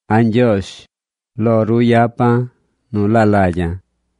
A̱ Ñgyoozh, lo ru yapa̱ nu laa lagya̱.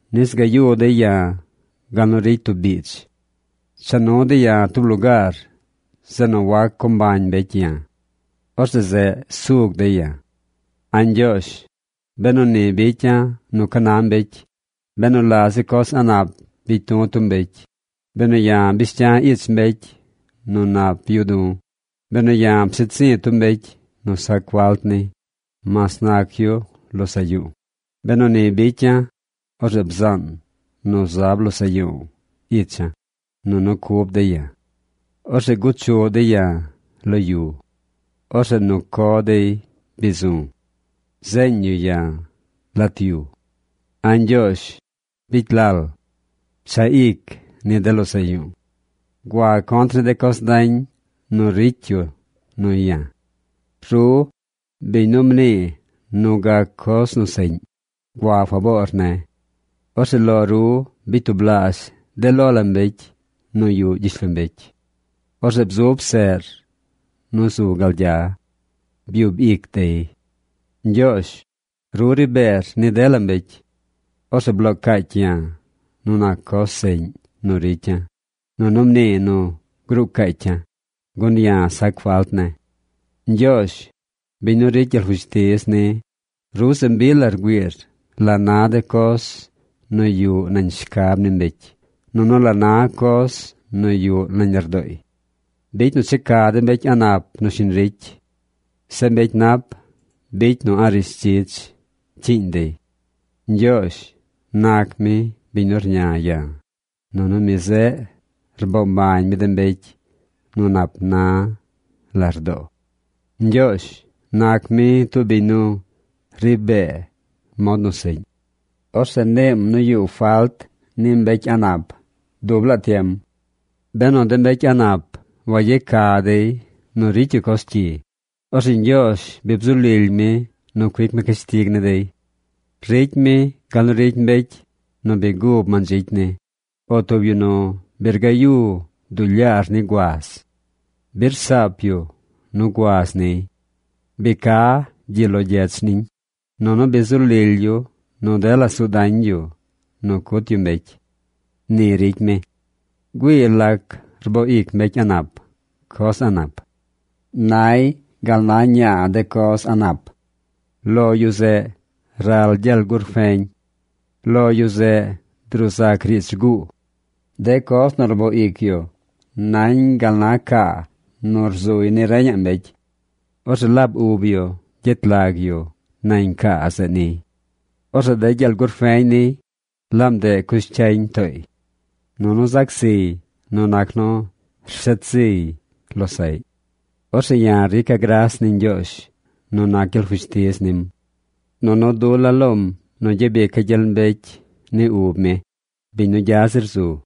nis gayu dey ya̱ gal nu ricy tub biidz. Cha nu dey ya̱ tub lugaar zeꞌ nu wac co mbañ mbecy ya̱. Orzeꞌ zeꞌ sug dey ya̱. A̱ Ñgyoozh, benu ni bicya̱ nu ca na mbecy, benu la zi coz a̱ꞌ nap bicy du̱ tub mbecy, benu ya̱ bish cya̱ ich mbecy nu nap yuꞌ du̱, benu ya̱ pshet zi̱ tub mbecy nu sac falt ni, mas nac yu losaꞌ yu̱u̱, benu ni bicya̱, orzeꞌ bzaan nu zab losaꞌ yu̱u̱ icha̱, nunu cub dey ya̱. Orzeꞌ guchuꞌ dey ya̱ lo yu. Orzeꞌ nu co dey bi zu̱. Zeeñ yu ya̱ lat yu. A̱ Ñgyoozh, bicy lal. Pchaꞌ ic ni de losaꞌ yu̱u̱. Gua contr ni de coz dañ nu ricy yu nuy ya̱. Ru, biñ nu mnii nu gac coz nu seꞌñ, gua faboor ne̱. Orzeꞌ lo ru bicy tublaazh de lo la mbecy nu yuꞌ gyishlombecy. Orzeꞌ bzub seꞌr nu zu gal gya. Byub ic dey. Ñgyoozh, ru ri beer ni dela mbecy. Orzeꞌ bloo caacy ya̱ nu nac coz seꞌñ nu ricya̱, nunu mnii nu gruu caacya̱, gun ya̱ sac falt ne̱. Ñgyoozh, biñ nu ricy gyel fushtiz ni, ru se mbi la rgüiir la na de coz nu yuꞌ nañ shcab ni mbecy nunu la na coz nu yuꞌ nañ lardooy. Bicy nu checa de mbecy a̱ꞌ nap nu shiñ ricy. Zeꞌ mbecy nap, bicy nu a̱ꞌ rishdzidz cyiiñ dey. Ñgyoozh nac mi biñ nu rña ya̱, nunu mi zeꞌ rboo mbañ mi de mbecy nu nap na lardoo. Ñgyoozh nac mi tub biñ nu ri bee mod nu seꞌñ. Orzeꞌ niim nu yuꞌ falt ni mbecy a̱ꞌ nap dub laa tiem. Benu de mbecy a̱ꞌ nap wayeca dey nu ricy yu coz cyi, orzeꞌ Ñgyoozh bi bzu lily mi nu cuic mi cashtig ni dey. Ricy mi gal nu ricy mbecy nu bi gub mandzicy ni, o tub yu nu bi rgayu duu lyaar ni guaz. Bi rsaap yu nu guaz niy. Bi ca gyi lo gyech niñ, nunu bi zu lily yu nu dela suu dañ yu nu cut yu mbecy. Ni ricy mi. Güii lac rboo ic mbecy a̱ꞌ nap coz a̱ꞌ nap. Nay gal na ñaa de coz a̱ꞌ nap. Lo yu zeꞌ ral gyel gurfeñ. Lo yu zeꞌ druu zac riidz rguu. De coz nu rboo ic yu nañ gal na caa nu rzuy ni reñaꞌ mbecy. Orzeꞌ laab yu gyet lag yu nañ caa zeꞌ niy. Orzeꞌ de gyel gurfeñ niy, laab ndeꞌ cush cyañ tooy. Nunu zac ziy nu nac nu rshet ziy losaꞌy. Orzeꞌ ya̱ rica̱ gras ni Ñgyoozh nu nac gyel fushtiz nim. Nunu dula̱ lom nu gyabica̱ gyel mbecy ni ub mi, biñ nu gya zir zu.